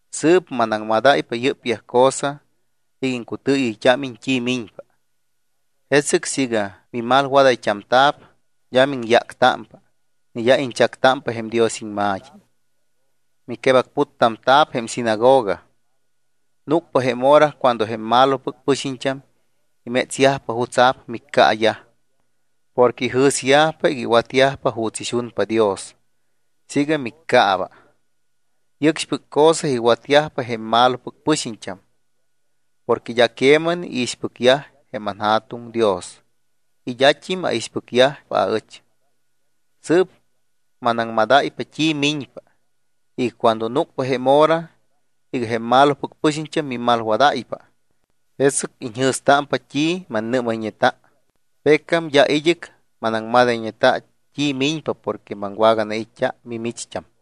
’Sɨɨp manaŋmadáypa yɨ́pyaj cosa iga iŋcutɨɨyɨyt́ámiñ t́i miñpa. Jesɨc siiga mimalwadayt́amta̱p, d́a miŋyáctámpa ni d́a iñchactámpa jém Dios iŋma̱t́i. Miquebacputtamta̱p jém sinagoga. Núcpa jém hora cuando jém malopɨc pɨxiñt́am imétsyajpa jutsa̱p miccaayaj, porque ijɨ̱syajpa iga iwatyajpa juuts ixunpa Dios siiga miccaaba. Yɨcxpɨc cosa iwatyajpa jém malopɨc pɨxiñt́am porque d́a queman iixpɨcyaj jém anJa̱tuŋ Dios y d́at́im aixpɨcyajpa aɨch. Sɨɨp manaŋmadáypa t́i miñpa iga cuando núcpa jém hora iga jém malopɨc pɨxiñt́am mimalwadáypa, jesɨc iñjɨ̱stámpa t́i mannɨ́mayñeta. Pecam d́a id́ɨc manaŋmadayñeta t́i miñpa porque maŋwaganait́t́a mimicht́am.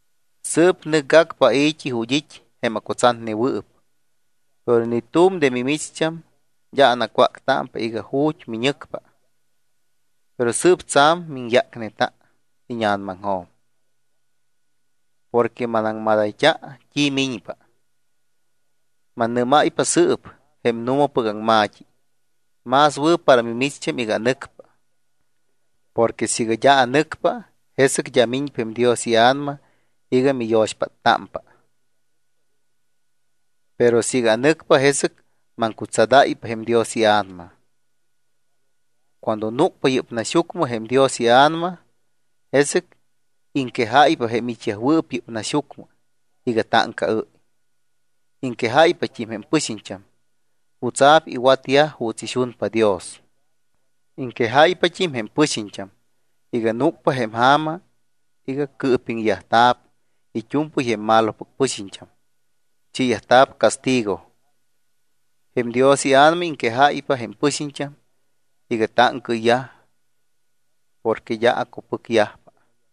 ’Sɨɨp nɨcgacpa ai̱t́i ju̱t́ it́ jém acutsatnewɨɨp. Pero ni tu̱m de mimicht́am d́a anacwáctámpa iga: “¿Ju̱t́ miñɨcpa?” Pero sɨɨp tsa̱m miŋyácneta íña̱namaŋjo̱m porque manaŋmadayt́a t́i miñpa. Mannɨ́máypa sɨɨp jém nu̱mapɨc aŋma̱t́i. Más wɨ̱ para mimicht́am iga anɨcpa. Porque siiga d́a anɨcpa, jesɨc d́a miñpa jém Dios iA̱nama iga miyo̱xpáttámpa. Pero siiga anɨcpa, jesɨc maŋcutsadáypa jém Dios iA̱nama. Cuando núcpa yɨ́p naxyucmɨ jém Dios iA̱nama, jesɨc iŋquejáypa jém it́yajwɨɨp yɨ́p naxyucmɨ iga táŋcaɨ́y. Iŋquejáypat́im jém pɨxiñt́am jutsa̱p iwatyaj juuts ixunpa Dios. Iŋquejáypat́im jém pɨxiñt́am iga núcpa jém ja̱ma iga cɨɨpiŋyajta̱p it́u̱mpɨy jém malopɨc pɨxiñt́am, chiiyajta̱p castigo. Jém Dios iA̱nama iŋquejáypa jém pɨxiñt́am iga táŋcaɨyyaj porque d́a acupɨcyajpa.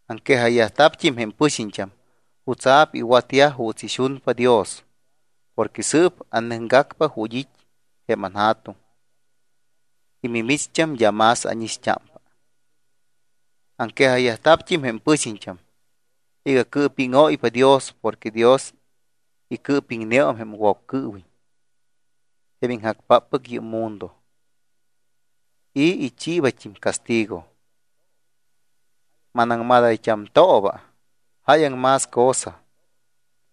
Aŋquejayyajta̱pt́im jém pɨxiñt́am jutsa̱p iwatyaj juuts ixunpa Dios porque sɨɨp anɨcgacpa ju̱t́ it́ jém anJa̱tuŋ y mimicht́am d́a más ánixt́ámpa. Aŋquejayyajta̱pt́im jém pɨxiñt́am iga cɨɨpíŋóypa Dios porque Dios icɨɨpiŋneum jém Woccɨɨwiñ, jém iŋjacpáppɨc yɨ́p mundo, y ichiibat́im castigo. ’Manaŋmadayt́amtooba jáyaŋ más cosa,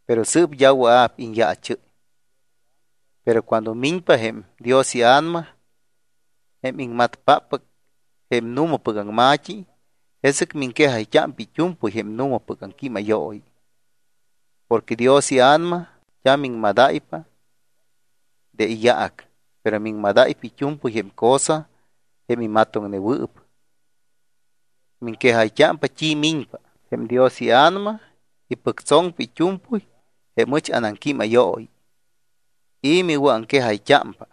pero sɨɨp d́a wɨa̱p iñyaachɨ́y. Pero cuando miñpa jém Dios iA̱nama jém iŋmatpáppɨc jém nu̱mapɨc aŋma̱t́i, jesɨc miŋquejayt́ámpa it́u̱mpɨy jém nu̱mapɨc aŋquímayooyi. Porque Dios iA̱nama d́a miŋmadáypa de iyaac, pero miŋmadáypa it́u̱mpɨy jém cosa jém imatoŋnewɨɨp. Miŋquejayt́ámpa t́i miñpa. Jém Dios iA̱nama ipɨctsoŋpa it́u̱mpɨy jém ɨch anaŋquímayooyi y miwɨ̱aŋquejayt́ámpa.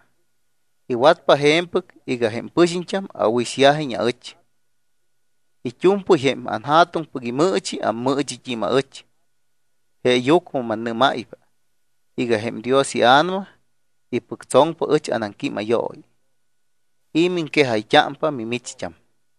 Iwatpa je̱mpɨc iga jém pɨxiñt́am awɨ̱ixyajiñ aɨch. It́u̱mpɨy jém anJa̱tuŋpɨc imɨɨchi, ammɨɨchit́im aɨch. Jeeyucmɨ mannɨ́máypa iga jém Dios iA̱nama ipɨctsoŋpa ɨch anaŋquímayooyi y miŋquejayt́ámpa mimicht́am.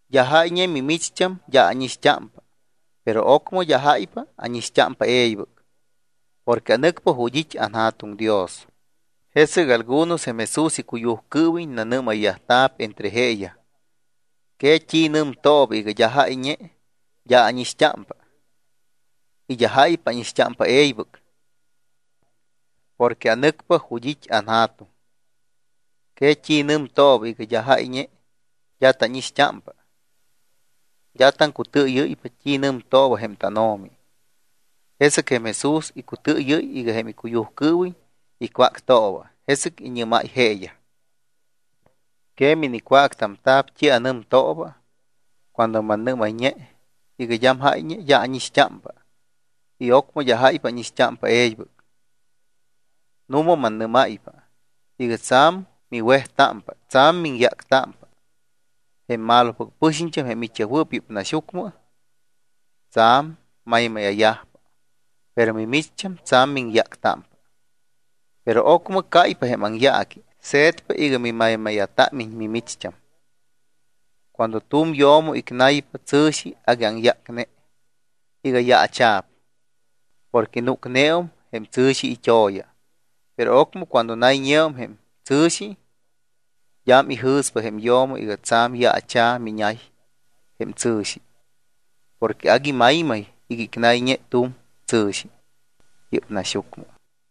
’D́a jáyñe mimicht́am d́a ánixt́ámpa. Pero ocmɨ d́a jáypa ánixt́ámpa e̱ybɨc. Porque anɨcpa ju̱t́ it́ anJa̱tuŋ Dios. Jesɨc algunos jém Jesús icuyujcɨɨwiñ nanɨ́mayyajta̱p entre jeeyaj: —¿Que t́i nɨmtooba iga: “d́a jáyñe d́a ánixt́ámpa”, y “d́a jáypa ánixt́ámpa e̱ybɨc” y “porque anɨcpa ju̱t́ it́ anJa̱tuŋ”? ¿Que t́i nɨmtooba iga: “d́am jáyñe d́a tánixt́ámpa”? D́a taŋcutɨɨyɨ́ypa t́i nɨmtooba jém tánO̱mi. Jesɨc jém Jesús icutɨɨyɨ́y iga jém icuyujcɨɨwiñ icwáctooba. Jesɨc iñɨ́máy jeeyaj: —¿Que minicwáctamta̱p t́i anɨmtooba cuando mannɨ́mayñe iga: “d́am jáyñe, d́a ánixt́ámpa” y ocmɨ, “d́a jáypa ánixt́ámpa e̱ybɨc”? Nu̱ma, mannɨ́máypa iga tsa̱m miwejtámpa, tsa̱m miŋyáctámpa. Jém malopɨc pɨxiñt́am jém it́yajwɨɨp yɨ́p naxyucmɨ tsa̱m maymáya̱yajpa. Pero mimicht́am tsa̱m miŋyáctámpa. Pero ocmɨ cáypa jém aŋyaaqui, se̱tpa iga mimaymáya̱támiñ mimicht́am. Cuando tu̱m yo̱mo icnaypa tsɨ̱xi, agui aŋyácne iga yaacha̱p porque núcneum jém tsɨ̱xi it́o̱ya. Pero ocmɨ cuando nayñeum jém tsɨ̱xi, d́am ijɨ̱spa jém yo̱mo iga tsa̱m yaacha̱ micnay jém tsɨ̱xi porque agui maymay iga icnayñe tu̱m tsɨ̱xi yɨ́p naxyucmɨ.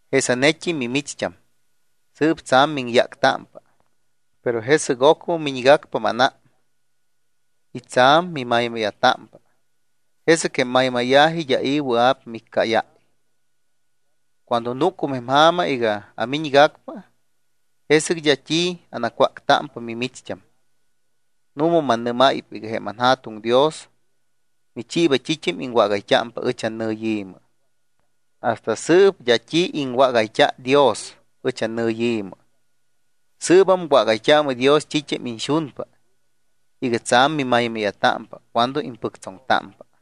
Jesanet́im mimicht́am sɨɨp tsa̱m miŋyáctámpa, pero jesɨc ocmɨ miñgacpa mánám y tsa̱m mimaymáya̱támpa. Jesɨc jém maymáya̱ji d́a i̱ wɨa̱p miccáyáy. Cuando núcum jém ja̱ma iga amiñgacpa, jesɨc d́a t́i anacwáctámpa mimicht́am. ’Nu̱ma mannɨ́máypa iga jém anJa̱tuŋ Dios michiiba t́it́am iŋwágayt́ámpa ɨch annɨyi̱mɨ. Hasta sɨɨp d́a t́i iŋwágayt́a Dios ɨch annɨyi̱mɨ. Sɨɨbam wágayt́aamɨ Dios t́it́am iñxunpa iga tsa̱m mimaymáya̱támpa cuando impɨctsoŋtámpa.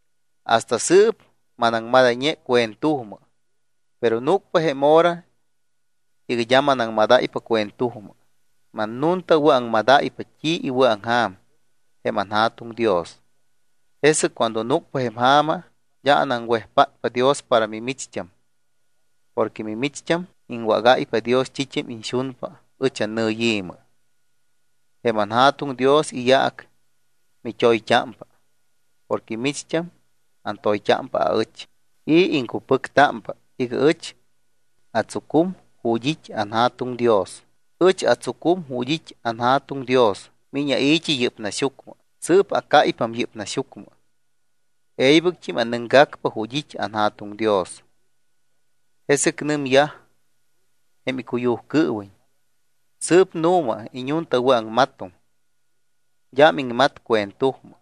’Hasta sɨɨp manaŋmadayñe cuentujmɨ, pero núcpa jém hora iga d́a manaŋmadáypa cuentujmɨ. Mannuntawɨ̱aŋmadáypa t́i iwɨ̱aŋja̱m jém anJa̱tuŋ Dios. Jesɨc cuando núcpa jém ja̱ma, d́a anaŋwejpátpa Dios para mimicht́am porque mimicht́am iŋwágáypa Dios t́it́am iñxunpa ɨch annɨyi̱mɨ. Jém anJa̱tuŋ Dios iyaac mit́oyt́ámpa porque micht́am antoyt́ámpa aɨch y iŋcupɨctámpa iga ɨch atsucum ju̱t́ it́ anJa̱tuŋ Dios. Ɨch atsucum ju̱t́ it́ anJa̱tuŋ Dios. Miñ ai̱t́i yɨ́p naxyucmɨ. Sɨɨp acáypam yɨ́p naxyucmɨ. E̱ybɨct́im anɨcgacpa ju̱t́ it́ anJa̱tuŋ Dios. Jesɨc nɨmyaj jém icuyujcɨɨwiñ: —Sɨɨp nu̱ma iññuntawɨ̱aŋmatum. D́am iŋmatpa cuentujmɨ.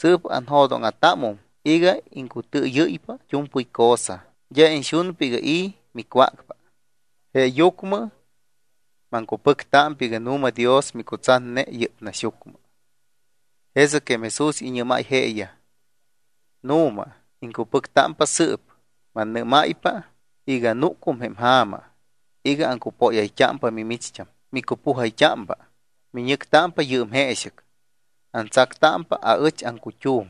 Sɨɨp anjo̱dóŋa̱támum iga iŋcutɨɨyɨ́ypa it́u̱mpɨy cosa, d́a iñxunpa iga i̱ micwácpa. Jeeyucmɨ maŋcupɨctámpa iga nu̱ma Dios micutsatne yɨ́p naxyucmɨ. Jesɨc jém Jesús iñɨ́máy jeeyaj: —¿Nu̱ma, iŋcupɨctámpa sɨɨp? Mannɨ́máypa iga núcum jém ja̱ma iga aŋcupóyayt́ámpa mimicht́am. Micupujayt́ámpa. Miñɨctámpa yɨɨm jeexɨc. Antsactámpa aɨch aŋcut́um.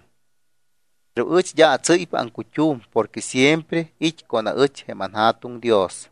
Pero ɨch d́a atsɨ́ypa aŋcut́um porque siempre it́ con aɨch jém anJa̱tuŋ Dios.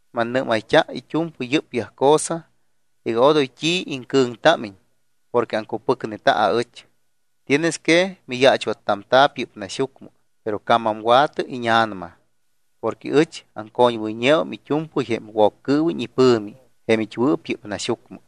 Mannɨ́mayt́a it́u̱mpɨy yɨ́pyaj cosa iga odoy t́i iŋcɨ̱ŋtámiñ porque aŋcupɨcneta aɨch. Tienes que miyaachwattamta̱p yɨ́p naxyucmɨ, pero camamwa̱tɨ íña̱nama porque ɨch aŋcoñwɨyñeum it́u̱mpɨy jém Woccɨɨwiñ ipɨ̱mi jém it́wɨɨp yɨ́p naxyucmɨ.